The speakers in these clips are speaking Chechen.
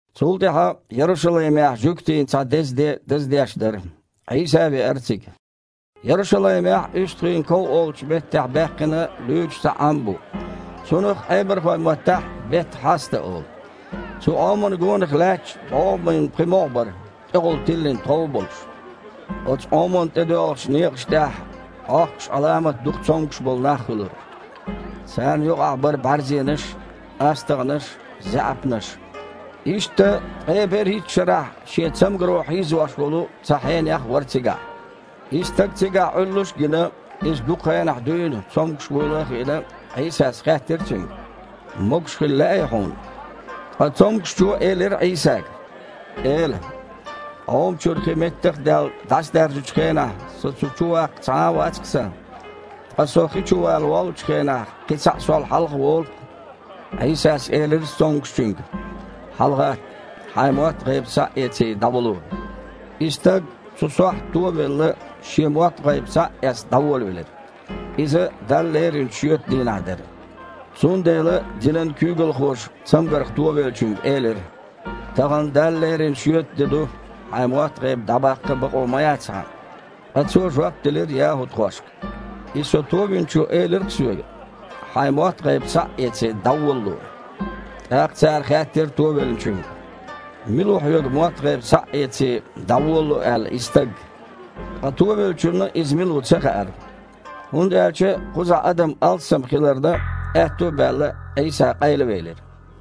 Цул тІаьхьа Ярушалаймехь жуьгтийн цхьа деза де даздеш дара. Іийса а веара цига. Ярушалаймехь УьстагІийн ков олучу меттехь баьккхина луьйчу цхьа Іам бу. Цунах Іебархойн маттахь Бет-Хьасда олу. Цу Іомана гонах лаьтташ бІогІамийн пхи могІа бара, тІехула тиллина тхов а болуш. Оцу Іомана тІедоьлхучу некъаш тІехь Іохкуш Іаламат дукха цомгуш болу нах хуьлура. Царна юкъахь бара бІаьрзенаш, астагІнаш, заьІапнаш. Иштта, ткъе берхІитта шарахь шен цамгаро хьийзош волу цхьа хьенех а вара цигахь. И стаг цигахь Іуьллуш а гина, иза дукха хенахь дуьйна цомгуш вуйла а хиъна, Іийсас хаьттира цуьнга: «Могуш хила лаьий хьуна?» Ткъа цомгушчо элира Іийсага: «Эла, Іома чуьра хи, меттах а даьлла, дІасадаьржачу хенахь со цу чуваккха цхьа а вац-кх сан. Ткъа со хи чувала воллучу хенахь, кхин цхьаъ сол хьалха волу-кх». Іийсас элира цомгушчуьнга: «ХьалагІатта, хьайн мотт-гІайба схьа а эций, дІаволало». И стаг, цу сохьта туо а велла, шен мотт-гІайба схьа а эцна, дІаволавелира. Иза Далла леринчу шоьтан дийнахь дара. Цундела динан куьйгалхоша цамгарх товеллачуьнга элира: «Тахана Далла лерина шоьтан де ду, хьайн мотт-гІайба дІабаккха а бакъо ма яц хьан». Ткъа цо жоп делира яхІудхошка: «И со Товинчо элира-кх соьга: „Хьайн мотт-гІайба схьа а эций, дІаволало“». ТІаккха цара хаьттира товеллачуьнга: «Мила ву хьоьга, мотт-гІайба схьа а эций, дІаволало аьлла и Стаг?» Ткъа товеллачунна Иза мила ву ца хаьара. ХІунда аьлча, кхузахь адам алссам хиларна, аьтту а баьлла, Іийса къайлавелира.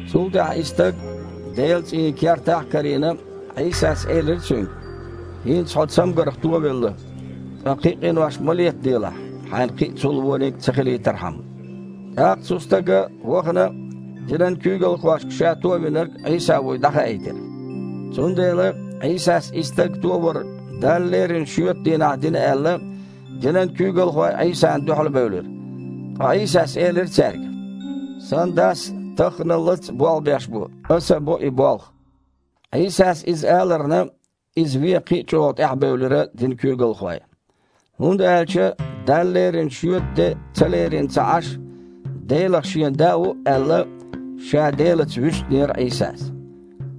Цул тІаьхьа и стаг Делан цІийнан кертахь а карийна, Іийсас элира цуьнга: «ХІинца хьо цамгарх товелла, ткъа кхин къинош ма летаделахь, хьайна кхин цул а вониг ца хилийтархьама». ТІаккха цу стага, вахана, динан куьйгалхошка ша Товинарг Іийса вуй дІахаийтира. Цундела, Іийсас и стаг туовар Далла лерина шоьтан дийнахь дина аьлла, динан куьйгалхой Іийсана дуьхьалбевлира. Ткъа Іийсас элира цаьрга: «Сан Дас тахханалц а болх беш бу, Аса а бо и болх». Іийсас иза аларна, Иза вен кхин а чІогІа тІаьхьабевлира динан куьйгалхой. ХІунда аьлча Далла лерина шоьтан де ца лерина а ца Іаш, Делах Шен Да ву а аьлла, Ша Делаца вуьстинера Іийсас.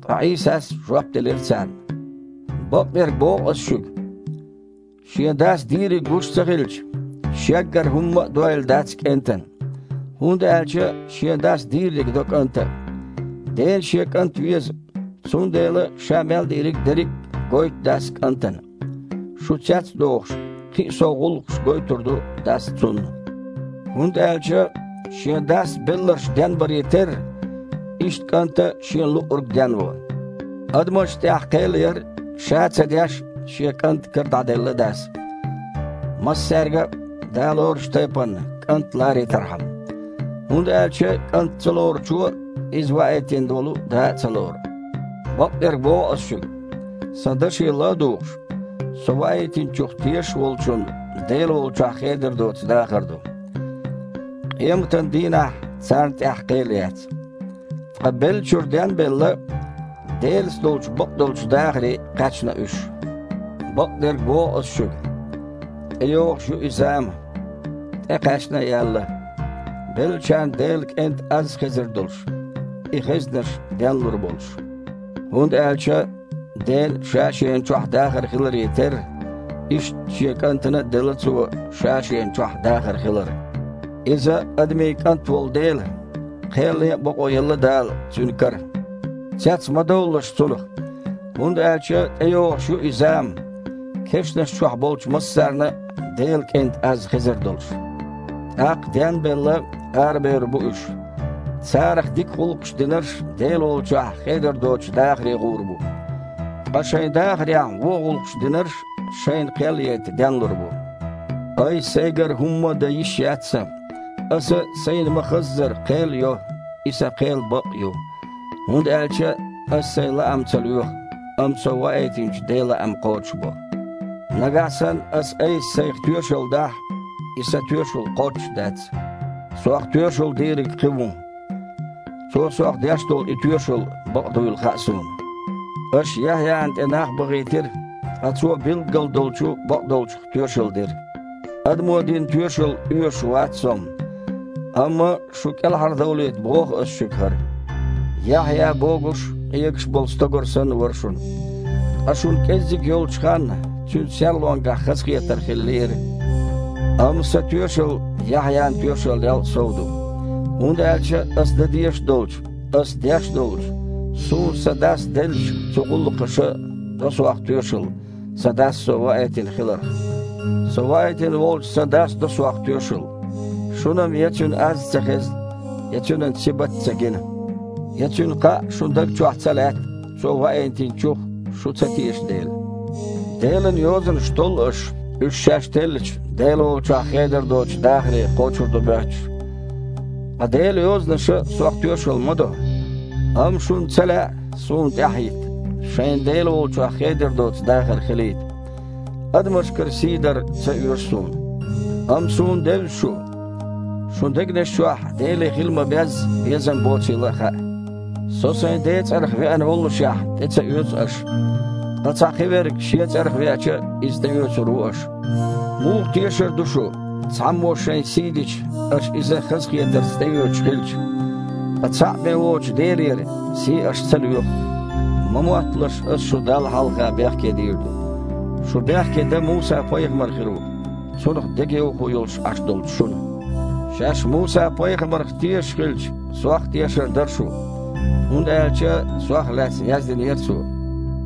Ткъа Іийсас жоп делира царна: «Бакъдерг боху Ас шуьга, Шен Дас дийриг гуш ца хилча, Шеггара хІумма а дойла дац КІентан. ХІунда аьлча Шен Дас дийрриг до КІанта а. Дена Шен КІант веза, цундела Ша мел дийриг дерриг а гойту Дас КІантана. Шу цец а дохуш, кхин а сов гІуллакхаш гойтур ду Дас Цунна. ХІунда аьлча Шен Дас белларш денбаре терра, иштта КІанта а Шена луъург денво. Адамашна тІехь кхел яр, Ша а ца деш, Шен КІентан кара дІаделла Дас, массаьрга а, Да лоручу тайпана, КІант а ларийтархьама. ХІунда аьлча КІант ца лоручо Иза ваийтина волу Да а ца лору. Бакъдерг боху Ас шуьга: Сан даше ладугІуш а, Со Ваийтинчух тешаш а волчун Дела волчохь хедар доцу дахар ду. Къематан дийнахь царна тІехь кхел яц, ткъа, беллачуьра ден а белла, Делаца долчу бакъдолчу дахаре кхаьчна уьш. Бакъдерг боху Ас шуьга: тІейогІуш ю и зама, тІекхаьчна а яьлла, беллачарна Делан КІентан аз а хезар долуш, и хезнарш ден а лур болуш. ХІунда аьлча Ден а Ша-Шена чохь дахар хиларе терра, иштта Шен КІантана а делла Цо Ша-Шена чохь дахар хилар. Иза Адамийн КІант волу дела, кхел ян а бакъо елла Дала Цуьнан кара. Цец ма довлалаш цунах, хІунда аьлча тІейогІуш ю и зама, кешнаш чохь болчу массарна а Делан КІентан аз хезар долуш. ТІаккха, ден а белла, арабевр бу уьш. Царах дика гІуллакхаш динарш Дела волчохь хедар доцучу дахаре гІур бу. Ткъа шайн дахарехь вон гІуллакхаш динарш шайна кхел яйта денлур бу. Айса-Сайгара хІумма а дан йиш яц Сан. Аса, Сайна ма-хаззара, кхел йо, и Сан кхел бакъ а ю. ХІунда аьлча Аса Сайн лаам ца лоьху, амма Со Ваийтинчу Ден лаам кхочушбо». «Нагахь санна Аса-Айса Сайх тоьшалла дахь, и Сан тоьшалла кхоччуш дац. Сох тоьшалла дийриг Кхин ву. Цо Сох деш долу и тоьшалла бакъ дуйла хаьа Суна. Аша Яхьъяна тІе нах бахийтира, ткъа цо билггал долчу бакъдолчух тоьшалла дира. Адамо дина тоьшалла оьшуш вац Со-м, амма шу кІелхьардовлийта боху Аса шуьга хІара. Яхьъя богуш а, къегаш а болу стогар санна вара шуна. Ткъа шуна кІеззиг йолчу ханна цуьнан серлонгахь хазахетар хила лиира. Амма Сан тоьшалла Яхьъян тоьшаллел а сов ду. ХІунда аьлча Аса дан дезаш а долчу, Аса деш а долчу, Суна Сан Дас деллачу цу гІуллакхаша до Сох тоьшалла Сан Дас Со ваийтина хиларх. Со ваийтина волчу Сан Дас до Сох тоьшалла. Шуна-м я Цуьнан аз а ца хезна, я Цуьнан сибат а ца гина. Я Цуьнан кхаъ а шун даг чохь ца лаьтта, Цо Ваийтинчух шу ца теша дела. Делан Йозанаш толлу аш, уьш шаьш теллича, Дела волчохь хедар доцучу дахаре кхочур ду моьттуш. Ткъа Делан Йозанаша Сох тоьшалла ма-до. Амма шуна ца лаьа Суна тІаьхьахІитта, шайна Дела волчохь хедар доцу дахар хилийта. Адамашкара сий дар ца оьшу Суна. Амма Суна девза шу, шун дегнаш чохь Деле хила ма-безза безам боцийла а хаьа. Со Сайн Ден цІарах веана воллушехь, тІе ца оьцу аша. Ткъа цхьа кхиверг шен цІарах веача, иза тІеоьцур ву аша. Муха тешар ду шу, цхьаммо шайн сий дича, аша иза хазахетарца тІеоьцуш хилча? Ткъа цхьаъ бен воцучу Делера сий аша ца лоьху. Ма мотталаш Ас шу Далла хьалха бехке дийр ду. Шу бехке дан Муса-пайхамар хир ву, цунах дегайовхо йолуш Іаш долчу шуна. Шаьш Муса-пайхамарах тешаш хилча, Сох а тешар дара шу, хІунда аьлча Сох лаьцна яздинера цо.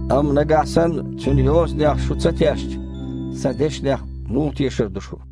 Амма нагахь санна цуьнан йозанех а шу ца тешча, Сан дешнех муха тешар ду шу?»